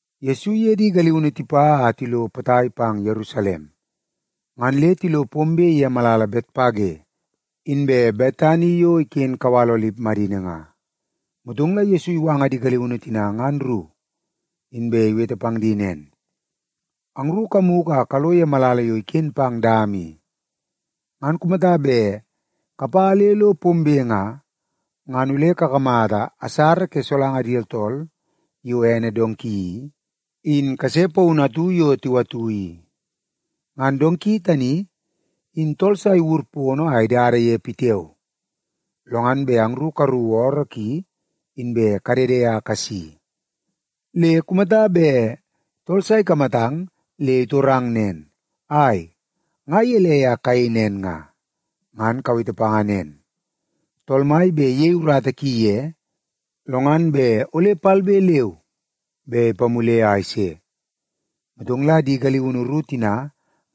Yesu iye di galiunu tipa a tilo potai pang Yerusalem, ngan le tilo pombe ye malala Betpage inbe Betani yo iken kawal Olip madini nga. Motong la Yesu iwanga di galiunu tina ngan ru, inbe iwete pang di nen, “Angru kamugu a kalo ye malala yo iken pang dama i. Ngan kumata bet kapa le lo pombe nga, ngan ole kakamata asara ke solanga di tooltool yo ene donki i, in kase paunu atu yo tiwatu i. Ngan donki tani in tool sa iwur pono a idada ye pitiao. Lo ngan bet angru karuku ooroo ki, inbe kadede a kasi. Le kumata bet tool sa ikamatang le itorang nen, ‘Ai, nga gelei a kayei nen nga?’ ngan kawete panga nen, ‘Tool Mai bet iyei urata ki ye, lo ngan bet ole palbe leu be ipamule a ise.’” Motong la di galiunu ru tina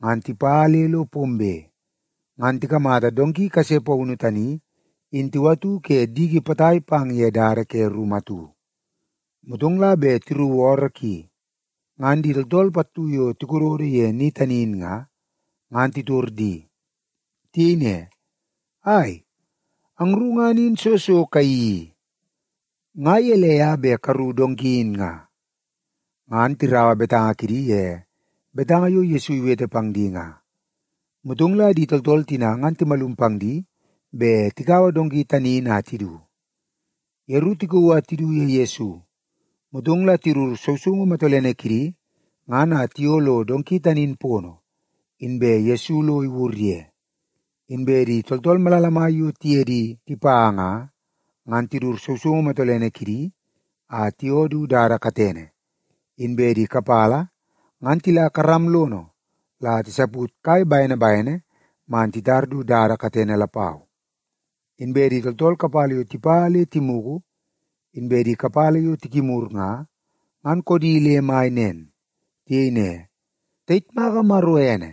ngan tipa le lo pombe, ngan tikamata donki kase paunu tani in tiwatu ke diki potai pang ye dada ke rumu atu. Motong la bet tiruku ooroo ki, ngan di tooltool pattu yo tikododo ye ni tani in nga, ngan titor di. Tiyei ne, “Ai, angru ngan in soo so kayeii i? Nga gelei a bet karuku donki in nga?” Ngan tiraua betanga kidi ye betanga yo Yesu iwete pang di nga. Motong la di tooltool tina ngan timalum pang di bet tikaua donki tani in a tidu. Yeru tikauu a tidu ye Yesu, motong la tidut sousoungu matolene kidi ngan a tiyoo lo donki tani in pono, inbe Yesu lo iwur ye. Inbe di tooltool malala mai yo tiye di tipa nga, ngan tidut sousoungu matolene kidi a tiyoo du dada katene, inbe di kapala ngan tila karam lono la tisaput kai bene bene man titar du dada katene lapau. Inbe di tooltool kapala yo tipa le timugu, inbe di kapala yo tikimur nga, ngan koodi le mai. Tiyei ne, “Tayitmaka Maro ene!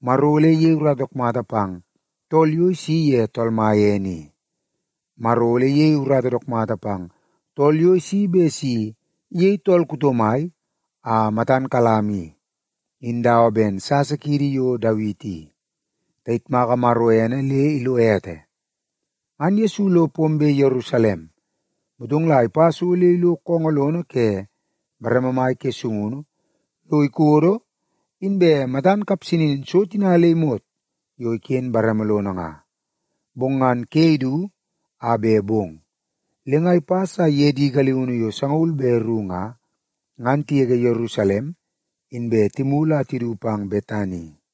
Maro ole iyei urata dook mata pang tool yo isi ye Tool Mai ene i. Maro ole iyei urata dook mata pang tool yo isi bet si iyei tool kuto mai a matan kalam i, in dawa ben sasa kiidi yo Dawiti i. Tayitmaka Maro ene le ilo ete!” Ngan Yesu lo pombe Yerusalem, motong la ipa so le ilo koongoo lono ke bareme mai ke sungunu lo ikodo inbe matan kapsanin so tina le imot yo iken bareme lono nga. Bong ngan ke idu a bet bong, le nga ipas a iye di galiunu yo sangaul be ru nga, ngan tigege Yerusalem inbe timulu a tidu pang Betani.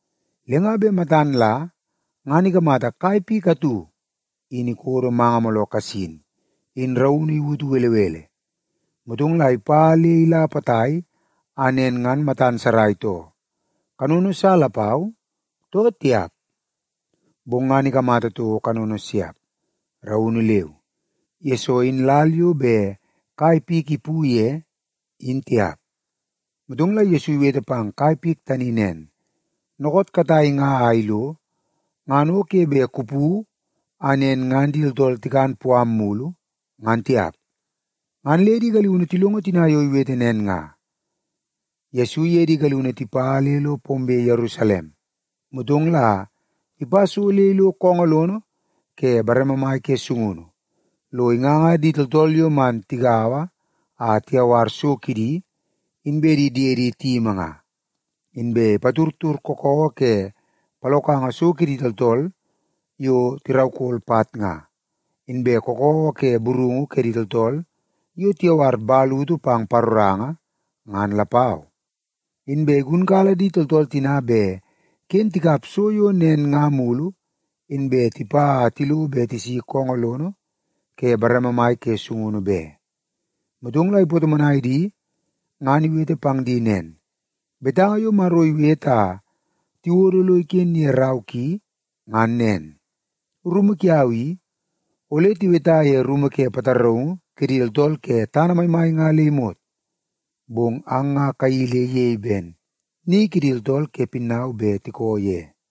Le nga bet matan la ngan ikamata kai pik atu in ikodo manga mooloo kasin in raunu iwutu belebele. Motong la ipa le ila potai a nen ngan matan sarai too, kanono sa lapau, too tiap. Bong ngan ikamata toko kanono siap, raunu leu, yesoo in lal yo bet kai pik ipu ye, in tiap. Motong la Yesu iwete pang kai pik tani nen, “Dookoot katai nga a ilo, ngan o ke bet kupu a nen ngan di tooltool tikan puam mulu, ngan tiap.” Ngan le di galiunu tilongo tina yo iwete nen nga. Yesu iye di galiunu tipa le lo pombe Yerusalem, motong la ipa so le ilo koongoo lono ke bareme mai ke sungunu lo inganga di tooltool yo man tigaua a tiyawar so kidi inbe di diedi tiyimi nga. Inbe ipatudtud kakawa ke palokanga so kidi tooltool yo tiraukol pat nga, inbe kakawa ke burungu kidi tooltool yo tiyawar man utu pang paroranga, ngan lapau Inbe igunkala di tooltool tina bet ken tikap so yo nen nga mulu inbe tipa a tilo bet tisi koongoo lono ke bareme mai ke sungunu be. Motong la ipatomonai di ngan iwete pang di nen, “Betanga yo Maro iwete a tiwodo lo iken ye rau ki ngan nen, ‘Rumu kiau i, ole tiweta ye rumu ke pataraungu kidi tooltool ke tana maimai nga le imot.’ Bong ang nga kayeii le iyei ben ‘ni kidi tooltool ke pinnau bet tiko ye.’”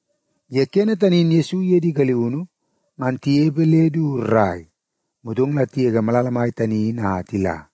Ye kene tani in Yesu iye di galiunu ngan tinepe le du rrai, motong la tigege malala mai tani in a tila.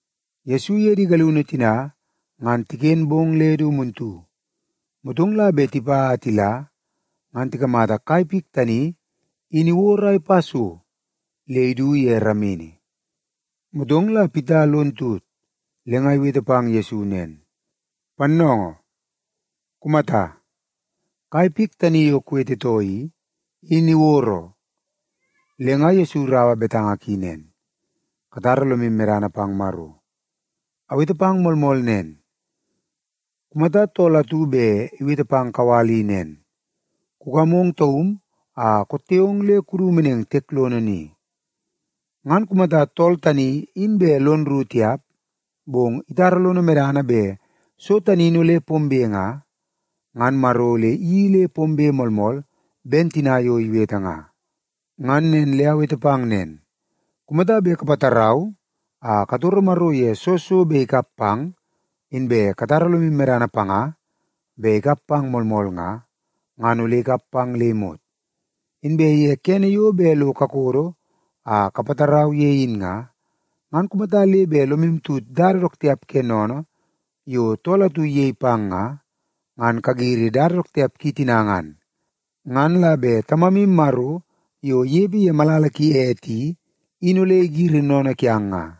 Yesu iye di galiunu tina ngan tiken bong le du muntu, motong la bet tipa a tila, ngan tikamata kai pik tani in iwod a ipa so le idu ye ramini. Motong la Pita lon tut le nga iwete pang Yesu nen, “Pannoongoo, kumata! Kai pik tani yo kuwetetoo i, in iwod oo.” Le nga Yesu iraua betanga ki nen, “Katara lomu medana pang Maro. Awete pang moolmool nen, kumata tool atu bet iwete pang kawal i nen, ‘Kumadit a ong taum kupas le kudu tiek lono ni,’ ngan kumata tool tani in bet lono rru tiap, bong itara lono medana bet so tani in ole pombe nga, ngan Maro ole iyeii le pombe moolmool ben tina yo iwete nga. Ngan nen le awete pang nen, kumata bet kapatarau a katoro Maro ye soo so bet ikap pang, inbe katara lomu medana panga bet ikap pang moolmool nga, ngan ole ikap pang le imot. Inbe ye kene yo bet lo kakodo a kapatarau ye in nga, ngan kumata le bet lomu tut dada dook tiap ke sennene yo tool atu iyei pang nga, ngan kagiri dada dook tiap ki tina ngan. Ngan la bet Tamamu Maro yo inepe ye malala ki ete i, in ole igiri sennene kiang nga.”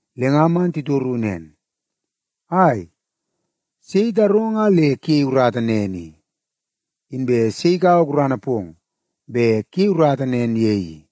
Le nga man titoru nen, “Ai, sei itarong a le kuyei urata nen i? Inbe sei ikaua gurana pong bet kuyei urata nen ye i?”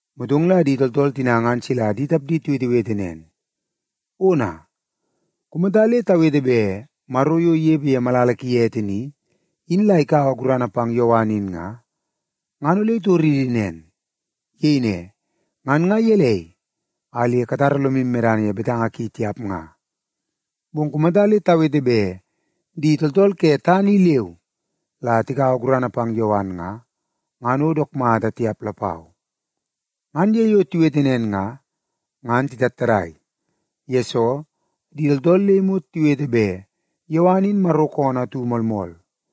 Motong la di tooltool tina ngan sila di tapdi tiwetewete nen, “Ona! Kumata le tawete bet Maro yo inepe ye malala ki ete ni, in la ikaua gurana pang Yowan in nga, ngan ole itoridi nen. Iyei ne, ‘Ngan nga gelei a le katara lomu medana ye betanga ki tiap nga?’ Bong kumata le tawete bet di tooltool ke tana i leu la tikaua gurana pang Yowan nga, ngan o dook mata tiap lapau.” Ngan ye yo tiwete nen nga, ngan titattadai, yesoo di tooltool le imot tiwete bet Yowan in Maro koonoo atu moolmool.